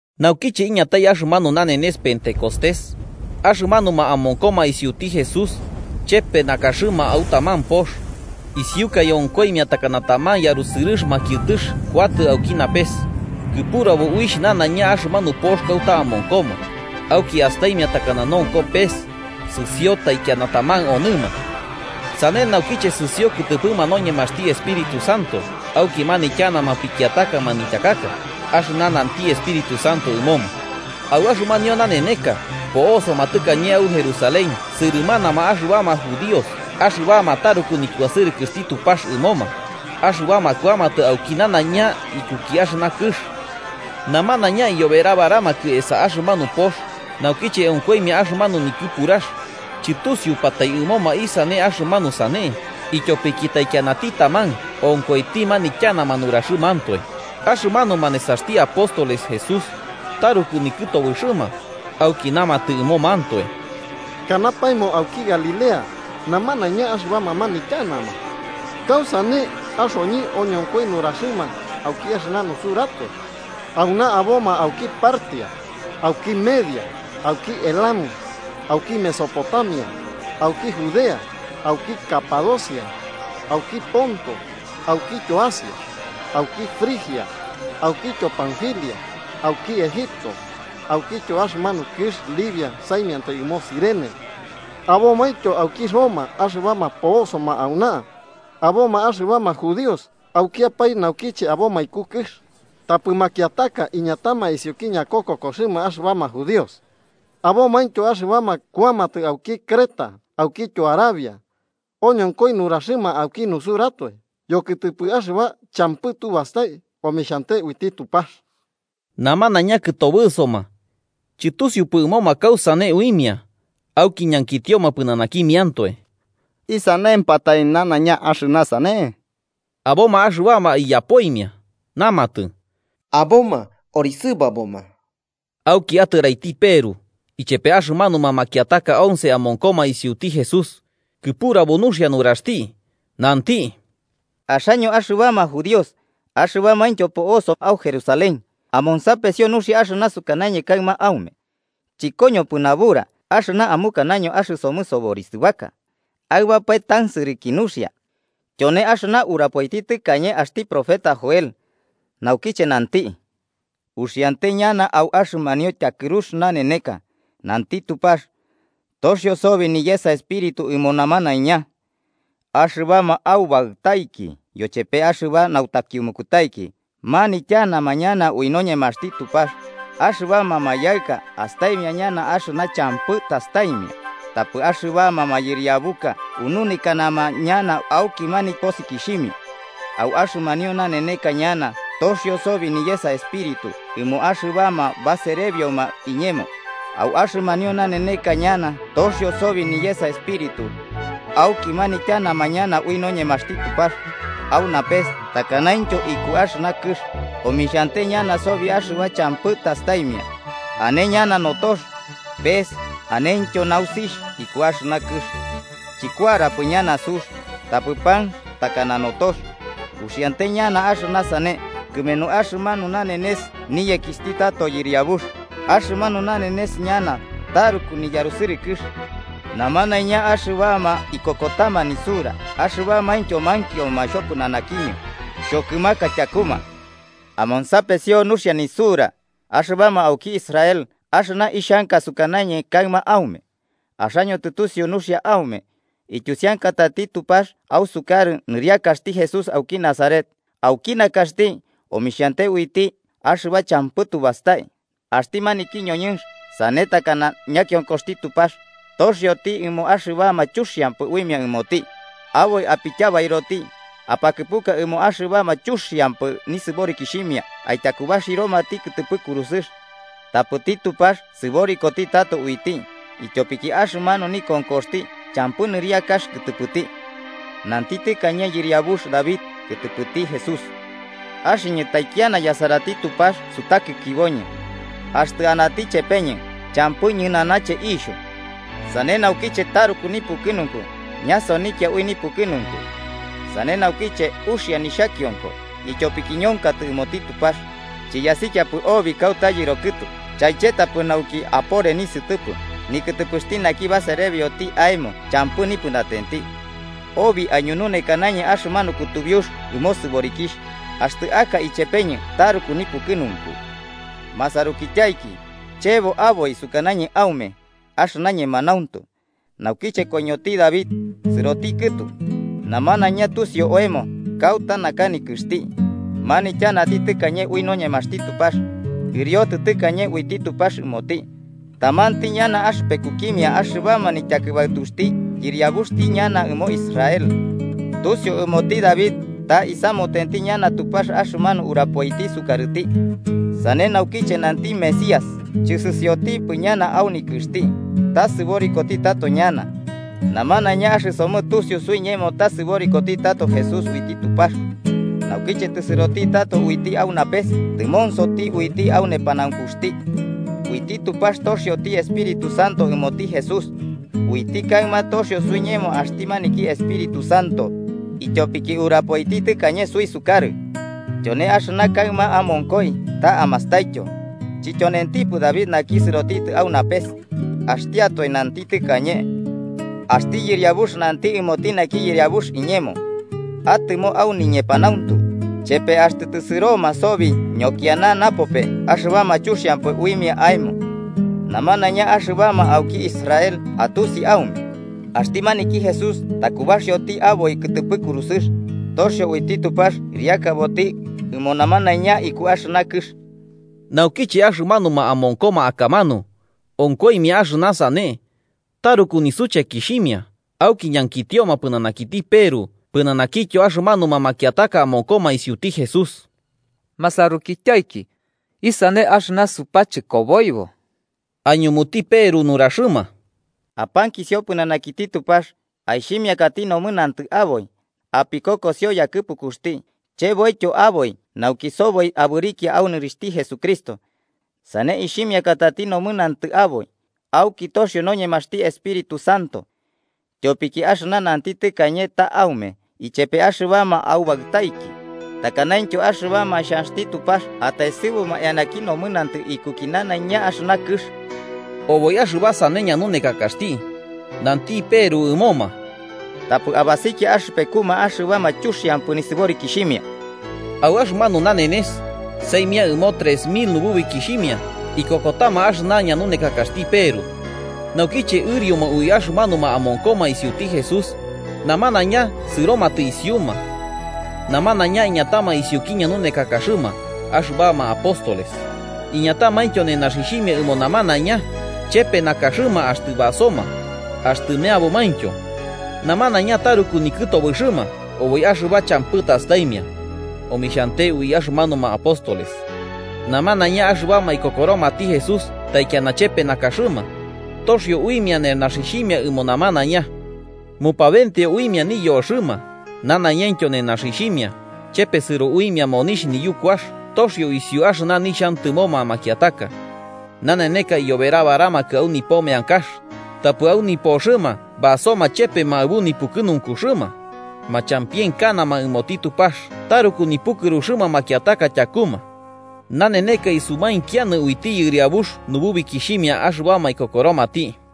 Naukiche iñatai axɨmanu nanenes Pentecostés, axɨmanuma amonkoma isiuti Jesús chepe nakaxɨma au taman pox. Isiukaɨ, onkoimia takana taman yarusɨrɨx makiɨtɨx kuatɨ auki napes kɨpurabo uixh nanaiña axɨmanu pox kauta amonkoma. Auki astaimia takana nonko pes, sɨsio taikiana taman onɨma. Sane naukiche sɨsio kɨtɨpɨma noñemaxti Espíritu Santo, auki manityanama pikiataka manityakaka, axɨna nanti Espíritu Santo ɨmoma. Au axɨmanio naneneka po'osoma tɨkañe au Jerusalén sɨrɨmanama axɨbama judíos axɨbama taruku nikuasɨrɨkɨxti Tupax ɨmoma, axɨbama kuamatɨ auki nanaiña ikuki axɨna kɨx. Namanaiña iyoberabaramakɨ esa axɨmanu pox, naukiche onkoimia axɨmanu nikɨpurax, chɨtusiupatai ɨmoma isane axɨmanu sane, ityopiki taikianati taman onkoiti manityanama nuraxɨmantoe axɨmanuma nesaxti apóstoles Jesús Taruku nikɨtobɨxɨma, auki namatɨ ɨmomantoe: –¿Kanapaemo auki Galilea namanaiña axɨbama manityanama? ¿Kausane axoñɨ oñonkoi nuraxɨma auki axɨna nusuratoe? Auna aboma auki Partia, auki Media, auki Elam, auki Mesopotamia, auki Judea, auki Capadocia, auki ponto aukityo Asia, auki Frigia aukityo panfilia, auki Egipto aukityo axɨmanu kɨx Libia saimiantai ɨmo Cirene. Abomaintyo auki Roma axɨbama po'osoma auna. Aboma axɨbama judíos aukiapae naukiche aboma iku kɨx, tapɨ makiataka iñatama isiuki ñakokokoxɨma axɨbama judíos. Abomaintyo axɨbama kuamatɨ auki Creta aukityo Arabia. ¡Oñonkoi nuraxɨma auki nusuratoe yokɨtɨpɨ axɨba champɨ tubastai omixhante uiti Tupax! Namanaiña kɨtobɨsoma, chɨtusiupɨ ɨmoma kausane uimia, auki ñankitioma pɨnanakimiantoe: –¿Isanempatai nanaiña axɨna sane? Aboma axɨbama iyapoimia, namatɨ: –¡Aboma orisɨbaboma! Auki atɨraiti Peru ichepe axɨmanuma makiataka once amonkoma isiuti Jesús, kɨpurabo nuxia nuraxti, nanti: “Axaño axɨbama judíos axɨbamaintyo po'oso au Jerusalén, amonsapesio nuxia axɨna sukañɨ kaɨma aume. Chɨkoñopɨ nabura axɨna amukanaño axɨsomɨ soborisɨbaka. ¡Aɨbapae tansɨrɨki nuxia! Tyone axɨna urapoiti tɨkañe Joel axti profeta, naukiche nanti: ‘Uxiante ñana au axɨmanio tyakɨrux naneneka, nanti Tupax, toxio sobi niyesa espíritu ɨmo namanaiña. Axɨbama aubaɨtaiki yochepe axɨba nautakiumukutaiki manityanama ñana ui noñemaxti Tupax, axɨbama mayaɨka astaimia ñana axɨna champɨ tastaimia, tapɨ axɨbama mayɨriabuka ununekanama ñana auki niposikixhimia. Au axɨmanio naneneka ñana toxio sobi niyesa Espíritu ɨmo axɨbama baserebioma iñemo, au axɨmanio naneneka ñana toxio sobi niyesa Espíritu, auki manityanama ñana ui noñemaxti Tupax. Au napes takanaintyo iku axɨna kɨx omixhante ñana sobi axɨba champɨ tastaimia, ane ñana notox, pes anentyo nausixh iku axɨna kɨx. Chɨkuarapɨ ñana sux, tapɨ panx takana notox, uxiante ñana axɨna sane kɨmenu axɨmanu nanenes niyekixhti tato Yɨriabux, axɨmanu nanenes ñana taruku niyarusɨrɨkɨx. Namanaiña axɨbama ikokotama nisura axɨbamaintyo mankioma xhopɨnanakiñɨ, xhokɨmaka tyakuma.’ “Amonsapesio nuxia nisura, axɨbama auki Israel axɨna ixhanka sukanañɨ kaɨma aume: Axaño tɨtusiu nuxia aume, ityusiankatati Tupax ausukarɨ nɨriakaxti Jesús auki Nazaret, auki nakaxti omixhante uiti axɨba champɨ tubastai. Axti maniki ñoñɨnx, sane takana ñakionkoxti Tupax, toxioti ɨmo axɨbama chuxiampɨ uimia ɨmoti, aboi apityabairoti, apakɨpuka ɨmoma axɨbama chuxiampɨ nisɨborikixhimia aityakubaxiromati kɨtɨpɨ kurusɨx. Tapɨti Tupax sɨborikoti tato uiti, ityopiki axɨmanu nikonkoxti champɨ nɨriakax kɨtɨpɨti. Nanti tɨkañe yɨriabux David kɨtɨpɨti Jesús: ‘Axɨñɨ taikiana yasarati Tupax sutakikiboñɨ. Axtɨ anati ichepeñɨ, champɨ ñɨnanache ixhu. Sane naukiche taruku nipukɨnunku ñasonikia ui nipukɨnunku. Sane naukiche uxia nixhakionko, ityopiki ñonkatɨ ɨmoti Tupax, chiyasikiapɨ obi kauta yɨro kɨtu chaichetapɨ nauki apore nisɨtɨpɨ nikɨtɨpɨxti naki baserbioti aemo champɨ nipɨnatenti. Obi aiñununekanañɨ axɨmanu kutubiux ɨmo sɨborikixh, axtɨ aka ichepeñɨ taruku nipukɨnunku.’ “Masarukityaiki, chebo aboi sukanañɨ aume axɨna ñemanauntu, naukiche koiñoti David, sɨroti kɨtu, namanaiña tusiu oemo kauta naka nikɨxti. Manityanati tɨkañe ui noñemaxti Tupax, ɨriotɨ tɨkañe uiti Tupax ɨmoti, tamanti ñana axɨpekukimia axɨbama nityakɨbaɨtuxti yɨriabuxti ñana ɨmo Israel. Tusiu ɨmoti David ta isamutenti ñana Tupax axɨmanu urapoiti sukarɨti. Sane naukiche nanti Mesías chɨsɨsiotipɨ ñana au nikɨxti, ta sɨborikoti tato ñana. Namanaiña axɨsomɨ tusiu suiñemo ta sɨborikoti tato Jesús uiti Tupax. Naukiche tɨsɨrotitɨ tato uiti au napes tɨmonsoti uiti au nepanaunkuxti. Uiti Tupax toxioti Espíritu Santo ɨmoti Jesús. Uiti kaɨma toxio suiñemo axti maniki Espíritu Santo, ityopiki urapoiti tɨkañe suisukarɨ. ¡Tyone axɨna kaɨma amonkoi ta amastaityo! Chityonentipɨ David naki sɨrotitɨ au napes, axtiatoe nanti tɨkañe: ‘Axti Yɨriabux nanti ɨmoti naki Yɨriabux iñemo: Atɨmo au niñepanauntu, chepe axtɨ tɨsɨroma sobi ñokiana napope axɨbama chuxiampɨ uimia aemo.’ “Namanaiña axɨbama auki Israel atusi aume, axti maniki Jesús takubaxioti aboi kɨtɨpɨ kurusɨx, toxio uiti Tupax ɨriakaboti ɨmo namanaiña iku axɨna kɨx.” Naukiche axɨmanuma amonkoma akamanu onkoimia axɨna sane, taruku nisuchekixhimia auki ñankitioma pɨnanakiti Peru pɨnanakityo axɨmanuma makiataka amonkoma isiuti Jesús: –Masarukityaiki, ¿isane axɨna supachɨkoboibo? Aiñumuti Peru nuraxɨma: –Apankisio pɨnanakiti Tupax, aixhimiakati nomɨnantɨ aboi, apikokosio yakɨpukuxti, cheboityo aboi nauki soboi abɨrikia au nɨrixhti Jesucristo. Sane ixhimiakatati nomɨnantɨ aboi, auki toxio noñemaxti Espíritu Santo. Tyopiki axɨna nanti tɨkañe ta aume ichepe axɨbama aubaɨtaiki, takanaintyo axɨbama xhanxti Tupax ataesɨbuma eanaki nomɨnantɨ ikuki nanaiña axɨna kɨx. Oboi axɨba sane ñanunekakaxti, nanti Peru ɨmoma: –¡Tapɨ abasikia axɨpekuma axɨbama chuxiampɨ nisɨborikixhimia! Au axɨmanu nanenes, saimia ɨmo trex mil nububikixhimia ikokotama axɨna ñanunekakaxti Peru. Naukiche ɨrioma ui axɨmanuma amonkoma isiuti Jesús, namanaiña sɨromatɨ isiuma. Namanaiña iñatama isiuki ñanunekakaxɨma axɨbama apóstoles, iñatamaintyo nenaxixhimia ɨmo namanaiña, chepe nakaxɨma axtɨ basoma, axtɨ meabomaintyo. Namanaiña taruku nikɨtobɨxɨma oboi axɨba champɨ tastaimia, omixhante ui axɨmanuma apóstoles. Namanaiña axɨbama ikokoromati Jesús taikiana chepe nakaxɨma, toxio uimia nenaxixhimia ɨmo namanaiña. Mupabenteo uimia niyoxɨma nanaiñaintyo nenaxixhimia, chepesɨro uimia monixh niyukuax, toxio isiu axɨna nixhantɨmoma makiataka. Naneneka iyoberabaramakɨ au nipo meankax, tapɨ au nipoxɨma basoma chepema aɨbu nipukɨnunkuxɨma. Machampienkanama ɨmoti Tupax taruku nipukɨruxɨma makiataka tyakuma. Naneneka isumainkianɨ uiti Yɨriabux nububikixhimia axɨbama ikokoromati.